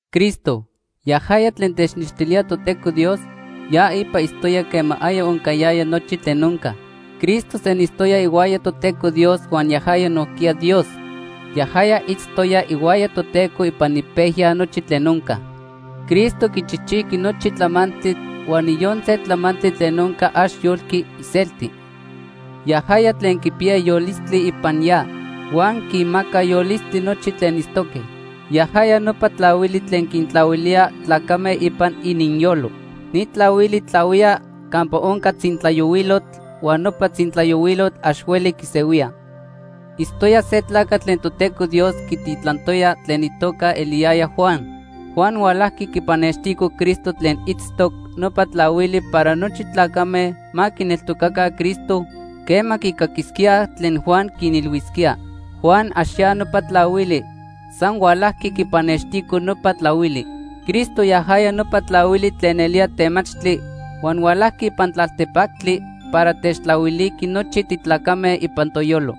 Cristo, yajaya tlen tenextilía Toteco Dios, ya ipa itztoya quema aya oncayaya nochi tlen onca. Cristo senitztoya ihuaya Toteco Dios huan yajaya nojquiya Dios. Yajaya itztoya ihuaya Toteco ipan ipejya nochi tlen onca. Cristo quichijchijqui nochi tlamantli huan niyon se tlamantli tlen onca ax yolqui iselti. Yajaya tlen quipiya yolistli ipan ya huan quinmaca yolistli nochi tlen itztoque. Yajaya nopa tlahuili tlen quintlahuilía tlacame ipan ininyolo. Ni tlahuili tlahuía campa onca tzintlayohuilotl huan nopa tzintlayohuilotl ax hueli quisehuía. Itztoya se tlacatl tlen Toteco Dios quititlantoya tlen itoca eliyaya Juan. Juan hualajqui quipannextico Cristo tlen itztoc nopa tlahuili para nochi tlacame ma quineltocaca Cristo quema quicaquisquíaj tlen Juan quinilhuisquía. Juan ax ya nopa tlahuili. San hualajqui quipannextico nopa tlahuili. Cristo yajaya nopa tlahuili tlen nelía temachtli huan hualajqui ipan tlaltepactli para techtlahuiliqui nochi titlacame ipan toyolo.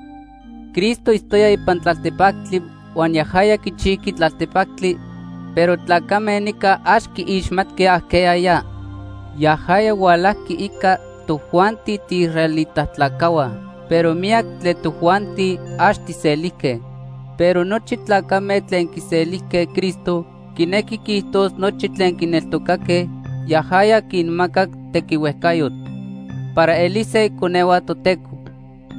Cristo itztoya ipan tlaltepactli huan yajaya quichijqui tlaltepactli, pero tlacame nica ax quiixmatque ajqueya ya. Yajaya hualajqui ica tojuanti tiisraelita tlacajhua, pero miyac tlen tojuanti ax tijselijque. Pero nochi tlacame tlen quiselijque Cristo, quinequi quiijtos nochi tlen quineltocaque, yajaya quinmacac tequihuejcayotl para elise iconehua Toteco.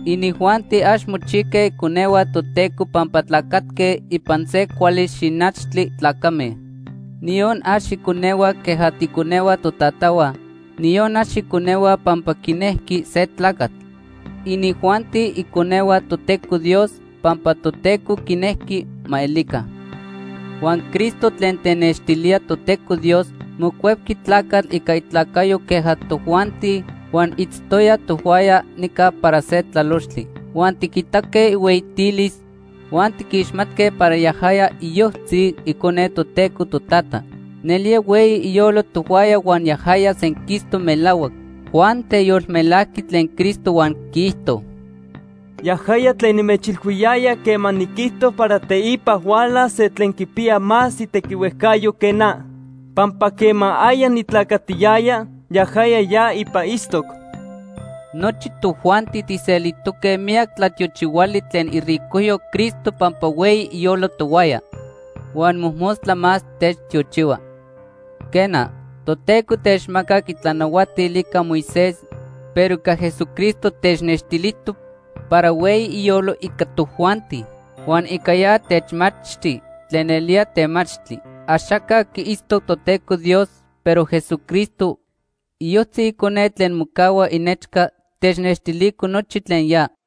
Inijuanti ax mochijque iconehua Toteco pampa tlacatque ipan se cuali xinachtli tlacame. Niyon ax iconehua queja tiiconehua totatahua, niyon ax iconehua pampa quinejqui se tlacatl. Inijuanti iconehua Toteco Dios pampa Toteco quinejqui ma elica. Huan Cristo tlen tenextilía Toteco Dios mocuepqui tlacatl ica itlacayo queja tojuanti huan itztoya tohuaya nica para se tlalochtli. Huan tiquitaque ihueyitilis huan tiquixmatque para yajaya iyojtzi Icone Toteco Totata. Nelía hueyi iyolo tohuaya huan yajaya senquistoc melahuac. Juan teyolmelajqui tlen Cristo huan quiijto: “Yajaya tlen nimechilhuiyaya quema niquijto para teipa hualas se tlen quipiya más itequihuejcayo que na. Pampa quema aya nitlacatiyaya, yajaya ya ipa itztoc.” Nochi tojuanti tijselijtoque miyac tlatiochihuali tlen iricojyo Cristo pampa hueyi iyolo tohuaya. Huan mojmostla más techtiochihua. Quena, Toteco techmacac itlanahuatil ica Moisés, pero ica Jesucristo technextilijtoc para hueyi iyolo ica tojuanti. Huan ica ya techmachti tlen nelía temachtli. Axaca quiitztoc Toteco Dios, pero Jesucristo, iyojtzi Icone tlen mocahua inechca, technextilico nochi tlen ya.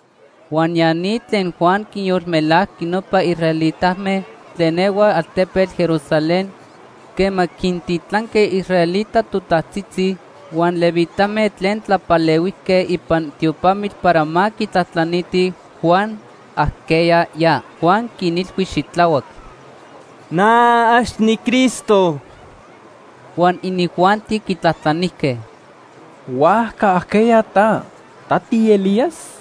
Huan ya ni tlen Juan quinyolmelajqui nopa israelitame tlen ehuaj altepetl Jerusalén quema quintitlanque israelita totajtzitzi huan levitame tlen tlapalehuijque ipan tiopamitl para ma quitlajtlanitij Juan ajqueya ya. Juan quinilhui xitlahuac: ―Na ax niCristo. Huan inijuanti quitlajtlanijque: ―¿Huajca ajqueya ta? ¿Ta tiElías?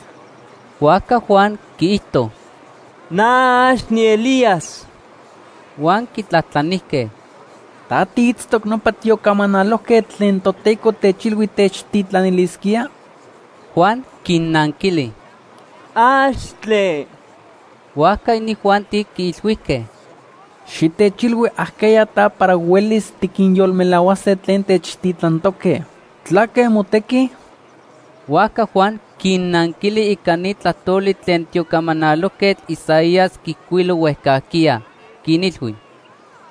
Huajca Juan quiijto: ―Na ax niElías. Huan quitlajtlanijque: ―¿Ta tiitztoc nopa tiocamanalojquetl tlen Toteco techilhui techtitlanilisquía? Juan quinnanquili: ―¡Axtle! Huajca inijuanti quiilhuijque: ―Xitechilhui ajqueya ta para huelis tiquinyolmelahuase tlen techtitlantoque. ¿Tlaque motequi? Huajca Juan quinnanquili ica ni tlajtoli tlen tiocamanalojquetl Isaías quiijcuilo huejcajquiya. Quinilhui: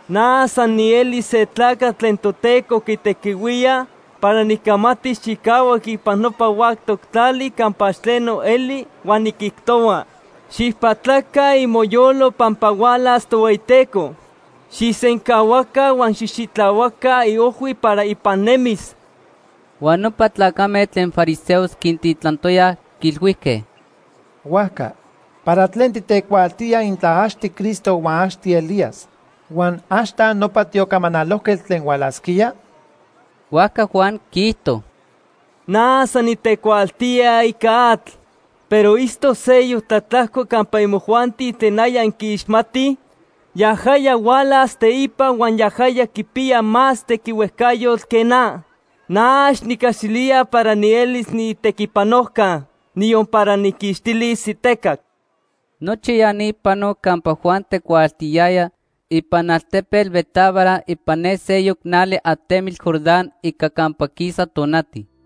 ―Na san nieli se tlacatl tlen Toteco quitequihuía para nicamatis chicahuac ipan nopa huactoc tlali campa ax tleno eli huan niquijtohua: ‘Xijpatlaca imoyolo pampa hualas Tohueyiteco. Xijsencahuaca huan xijxitlahuaca iojhui para ipan nemis.’ Huan nopa tlacame tlen fariseos quintitlantoyaj, quiilhuijque: ―Huajca, ¿para tlen titecuaaltía intla ax tiCristo huan ax tiElías, huan ax ta nopa tiocamanalojquetl tlen hualasquía? Huajca Juan quiijto: ―Na san nitecuaaltía ica atl, pero itztoc seyoc tlatlajco campa imojuanti tlen aya inquiixmatij. Yajaya hualas teipa huan yajaya quipiya más tequihuejcayotl que na. Na ax nicaxilía para nielis niitequipanojca, niyon para nijquixtilis itecac. Nochi ya ni panoc campa Juan tecuaaltiyaya ipan altepetl Betábara ipan ne seyoc nali atemitl Jordán ica campa quisa tonati.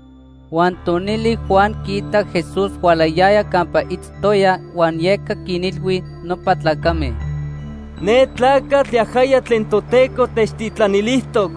Huan tonili Juan quiitac Jesús hualayaya campa itztoya huan yeca quinilhui nopa tlacame: “Ne tlacatl yajaya tlen Toteco techtitlanilijtoc.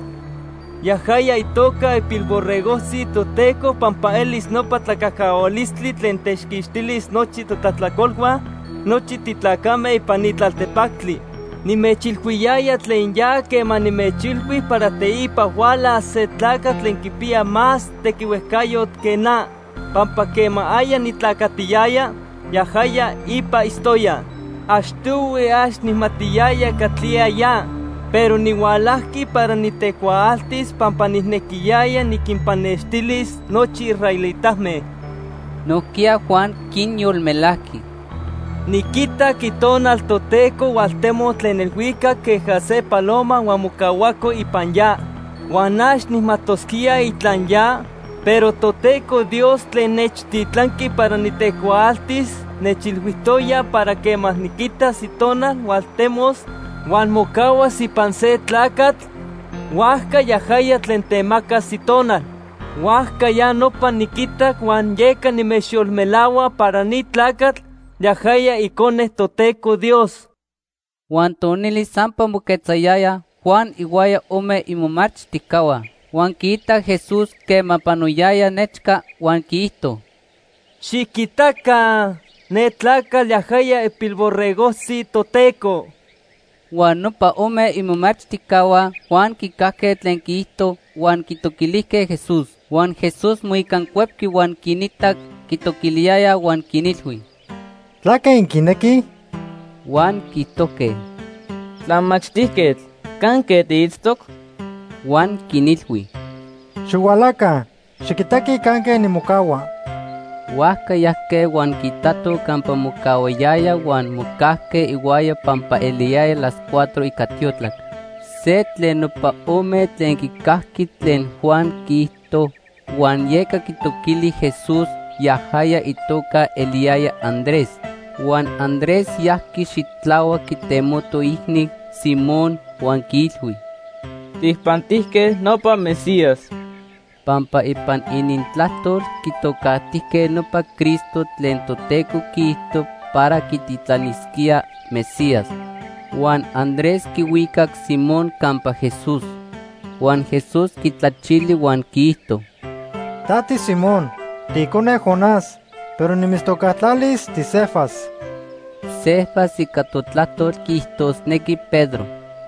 Yajaya itoca ipilborregojtzi Toteco pampa elis nopa tlacajcahualistli tlen techquixtilis nochi totlajtlacolhua nochi titlacame ipan ni tlaltepactli. Nimechilhuiyaya tlen ya quema nimechilhui para teipa hualas se tlacatl tlen quipiya más tequihuejcayotl que na pampa quema aya nitlacatiyaya, yajaya ipa itztoya. Achtohui ax nijmatiyaya catlía ya, pero nihualajqui para nitecuaaltis pampa nijnequiyaya niquinpannextilis nochi israelitame.” Nojquiya Juan quinyolmelajqui: “Niquitac Itonal Toteco hualtemoc tlen elhuicac queja se paloma huan mocahuaco ipan ya. Huan ax nijmajtosquía intla ya, pero Toteco Dios tlen nechtitlanqui para nitecuaaltis nechilhuijtoya para quema niquitas Itonal hualtemos huan mocahuas ipan se tlacatl, huajca yajaya tlen temacas Itonal. Huajca ya nopa niquitac huan yeca nimechyolmelahua para ni tlacatl, yajaya Icone Toteco Dios.” Huan tonili sampa moquetzayaya Juan ihuaya ome imomachtijcahua. Huan quiitac Jesús quema panoyaya nechca huan quiijto: ―Xiquitaca, ne tlacatl yajaya ipilborregojtzi Toteco. Huan nopa ome imomachtijcahua Juan quicajque tlen quiijto huan quitoquilijque Jesús. Huan Jesús moicancuepqui, huan quinitac quitoquiliyayaj huan quinilhui: ―¿Tlaque inquinequij? Huan quiijtojque: ―Tlamachtijquetl, ¿canque tiitztoc? Huan quinilhui: ―Xihualaca, xiquitaquij canque nimocahua. Huajca yajque huan quiitatoj campa mocahuayaya huan mocajque ihuaya pampa eliyaya las cuatro ica tiotlac. Se tlen nopa ome tlen quicajqui tlen Juan quiijto huan yeca quitoquili Jesús, yajaya itoca eliyaya Andrés. Huan Andrés yajqui xitlahuac quitemoto iicni, Simón, huan quiilhui: ―Tijpantijque nopa Mesías. (Pampa ipan inintlajtol quitocajtijque nopa Cristo tlen Toteco quiijto para quititlanisquía: ‘Mesías’.) Huan Andrés quihuicac Simón campa Jesús. Huan Jesús quitlachili huan quiijto: ―Ta tiSimón, tiicone Jonás, pero nimitztocajtlalis tiCefas. (Cefas ica totlajtol quiijtosnequi Pedro.)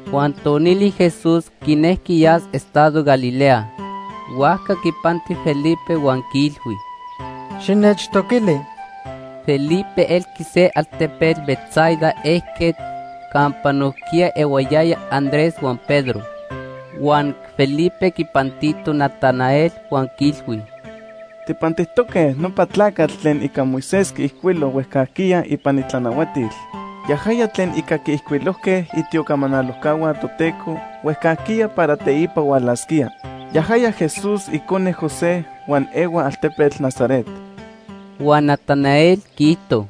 Huan tonili Jesús quinejqui yas estado Galilea. Huajca quipanti Felipe huan quiilhui: ―Xinechtoquili. Felipe elqui se altepetl Betsaida ejquetl campa nojquiya ehuayayaj Andrés huan Pedro. Huan Felipe quipantito Natanael huan quiilhui: ―Tijpantijtoque nopa tlacatl tlen ica Moisés quiijcuilo huejcajquiya ipan itlanahuatil. Yajaya tlen ica quiijcuilojque itiocamanalojcahua Toteco huejcajquiya para teipa hualasquía. Yajaya Jesús icone José huan ehua altepetl Nazaret. Huan Natanael quiijto: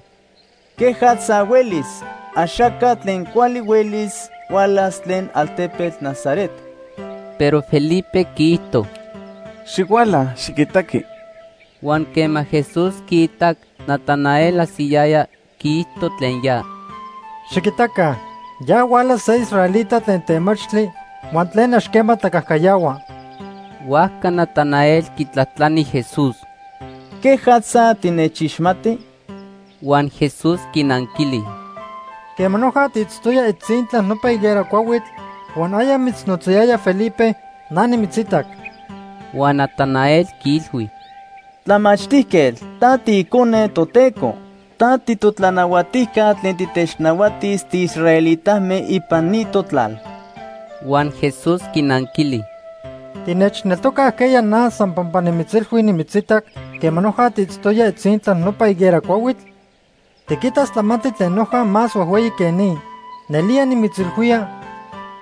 ―¿Quejatza huelis? Axaca tlen cuali huelis hualas tlen altepetl Nazaret. Pero Felipe quiijto: ―Xihuala, xiquitaqui. Huan quema Jesús quiitac Natanael ajsiyaya, quiijto tlen ya: ―Xiquitaca, ya huala se israelita tlen temachtli huan tlen ax quema tlacajcayahua. Huajca Natanael quitlajtlani Jesús: ―¿Quejatza tinechixmati? Huan Jesús quinanquili: ―Quema noja tiitztoya itzintla nopa higuera cuahuitl huan aya mitznotzayaya Felipe, na nimitzitac. Huan Natanael quiilhui: ―Tlamachtijquetl, ta tiIcone Toteco. Ta titotlanahuatijca tlen titechnahuatis tiisraelitame ipan ni totlal. Huan Jesús quinanquili: ―¿Tinechneltoca ajqueya na san pampa nimitzilhui nimitzitac quema noja tiitztoya itzintla nopa higuera cuahuitl? Tiquitas tlamantli tlen noja más huejhueyi que ni. Nelía nimitzilhuía,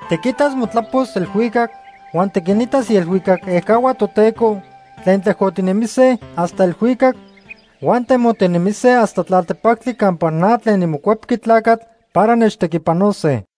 tiquitas motlapos elhuicac huan tiquinitas ielhuicac ejcahua Toteco tlen tlejcotinemise hasta elhuicac huan temotinemise hasta tlaltepactli campa na tlen niMocuepqui Tlacatl para nechtequipanose.